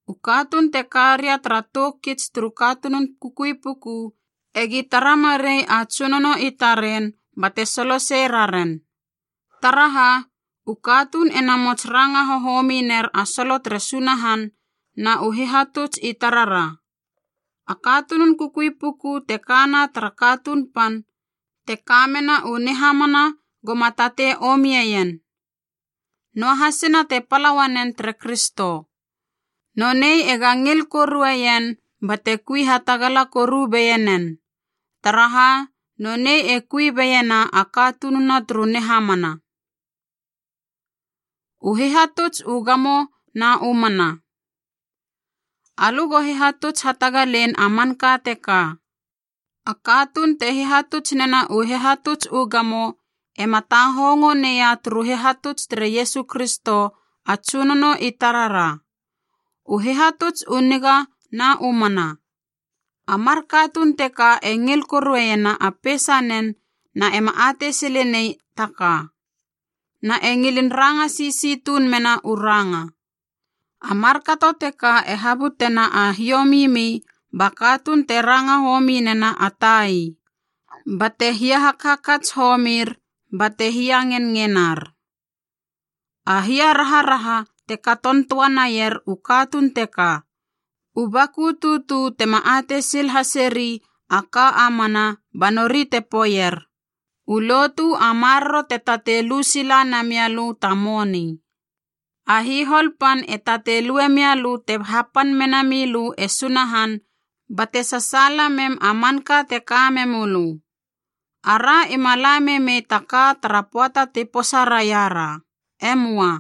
U katuun te karia tara tou kits turu katunun kukui puku egi tara marei a tsunono i taren bate solosei raren. Taraha, u katuun e namots ranga hohomi ner a solo tere Sunahan na u hihatuts i tarara. A katunun kukui puku te ka na tara katuun pan te kamena u nihamana goma tatei omieien, noahasina te pala uanen tere Kristo. Nonei ega ngil korueien bate kui hatagala koru beienen, taraha, nonei e kui beiena a katununa turu nihamana. U hihatuts u gamo na u mana Alö go hihatuts hatagalein a manka teka. A katuun te hihatuts nena u hihatuts u gamo ema tahongo neia turu hihatuts tere Iesu Kristo a Tsunono i tarara, u hihatuts u niga na u mana. A mar katuun teka e ngil koruena a peisanen na ema atei silenei ta ka, na e ngilin ranga sisi tuun mena u ranga. A markato teka e habutena a hiomimi ba katuun te ranga homi nena a tai, bate hiahakhakats homir bate hiangenngenar. A hiaraharaha te katon toa naier u katuun teka, u baku tutu tema atei sil haseri a ka a mana ba nori te poeier, u lotu a maroro te tatei lu sila namialö ta moni. A hihol pan e tatei lue mialö te hapan mena mi lö e Sunahan bate sasaala mem a manka te ka memölö. Ara ima la memei ta ka tara pöata ti posa raira, e möa.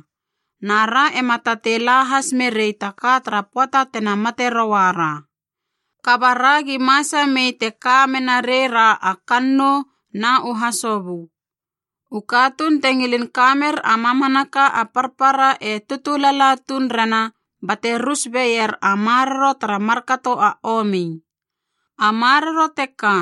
Na ra ema tatei la has merei ta ka tara pöata tena mate rouara. Kaba ragi masa mei te ka menarei ra a kannou na u hasobö. U katuun te ngilin ka mer a mamanaka a parpara e tutu lala tuun rena bate rus beier a maroro tara markato a omi. A maroro teka,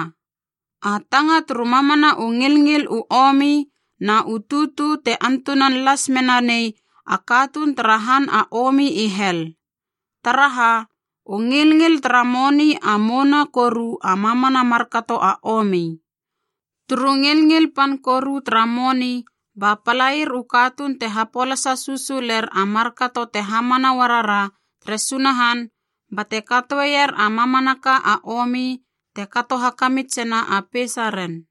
a tanga turu mamana u ngilngil u omi na u tutu te antunan las mena nei a katuun tara han a omi i hel. Taraha, u ngilngil tara moni a mouna koru a mamana markato a omi. Turu ngilngil pan koru tara moni ba palair u katuun te hapolasa susuler a markato te hamana uarara tere Sunahan bate katoeier a mamanaka a omi te kato hakamitsena a peisaren.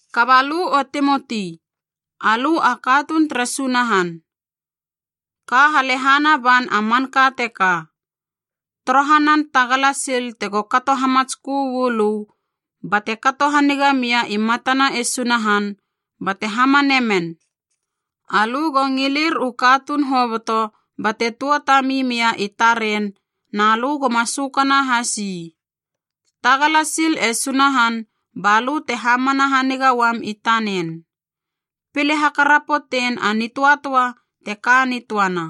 Kaba lö o Timoti, alö a katuun tere Sunahan, ka halehana ban a manka teka. Torohanan tagala sil tego kato hamatskö uu lö bate kato haniga mia i matana e Sunahan bate hamane men. Alö go ngilir u katuun hoboto bate tuatami mia i taren na lö goma sökana has ii. Tagala sil e Sunahan ba lö te hamana haniga uam i tanen. Pile hakarapotein a nitöatöa te ka nitöana.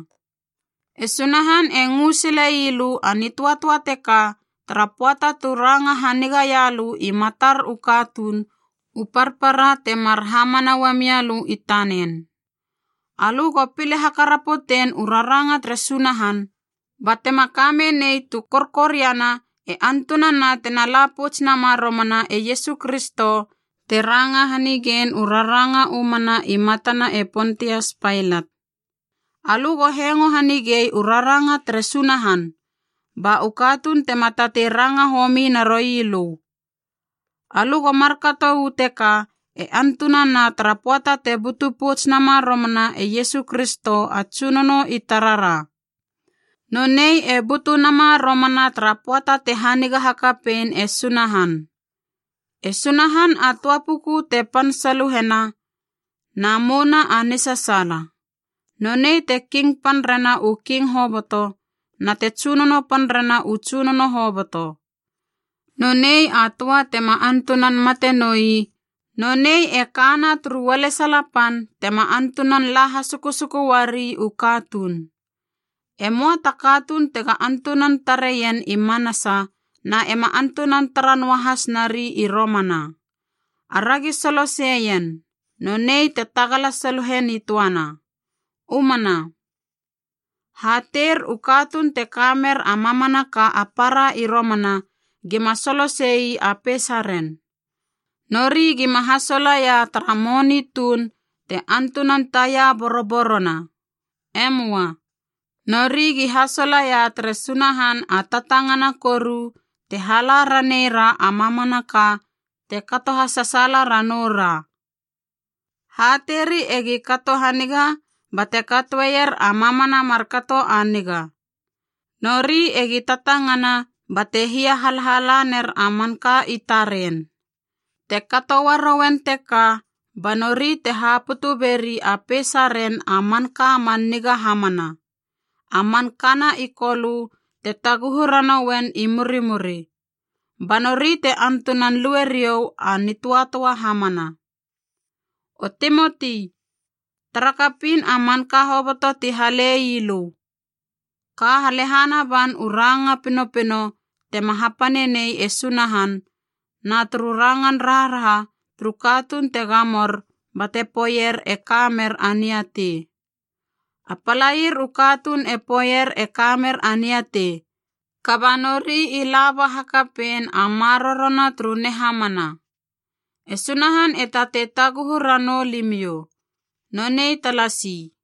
E Sunahan e ngö sile ii lö a nitöatöa teka tara pöata tu ranga hanigaia lö i matar u katuun u parpara temar hamana uamia lö i tanen. Alö go pile hakarapotein u raranga tere Sunahan batema kamenei tu korkoriana e antunana tena la pouts nama romana e Iesu Kristo te ranga hanigein u raranga u mana i matana e Pontias Pailat. Alö go hengo hanigei u raranga tere Sunahan, ba u katuun tema tatei ranga homi naroi lö. Alö go markato uu teka e antunana tara pöata te butu pouts nama romana e Iesu Kristo a Tsunono i tarara. Nonei e butu nama romana tara pöata te haniga hakapein e Sunahan. E Sunahan a töa puku te pan saluhena na mouna a nisasaala. Nonei te King pan rena u king hoboto na te Tsunono pan rena u tsunono hoboto. Nonei a töa tema antunan mate noi na nonei e kana turu ualesala pan tema antunan la hasukusuku uari u katuun. Emoa ta katuun tega antunan tareien i manasa na ema antunan tara noahas nari i romana. Aragi soloseien, nonei te tagala saluhe nitöana. U mana. Hateir u katuun te ka mer a mamanaka a para i romana gima solose ii a peisaren. Nori gima hasolaia tara moni tuun te antunan taia boroborona. E möa. Nori gi hasolaia tere Sunahan a tatangana koru te hala raneira a mamanaka te kato hasasaala ranoura. Hateiri egi kato haniga bate katoeier a mamana markato a niga. Nori egi tatangana bate hia halhala ner a manka i taren. Te kato uarouen teka ba nori te haputu beri a peisaren a manka man niga hamana, a man kana i Kolö te taguhu ranouen i murimuri. Ba nori te antunan lue riou a nitöatöa hamana. O Timoti, tara kapiin a manka hoboto ti hale ii lö. Ka halehana ban u ranga pinopino tema hapane nei e Sunahan, na turu rangan raharaha turu katuun te gamor bate poeier e ka mer a niatei. A palair u katuun e poeier e ka mer a niatei, kaba nori i laba hakapein a marorona turu nihamana. E Sunahan e tatei taguhu ranou limiou. Nonei talasi.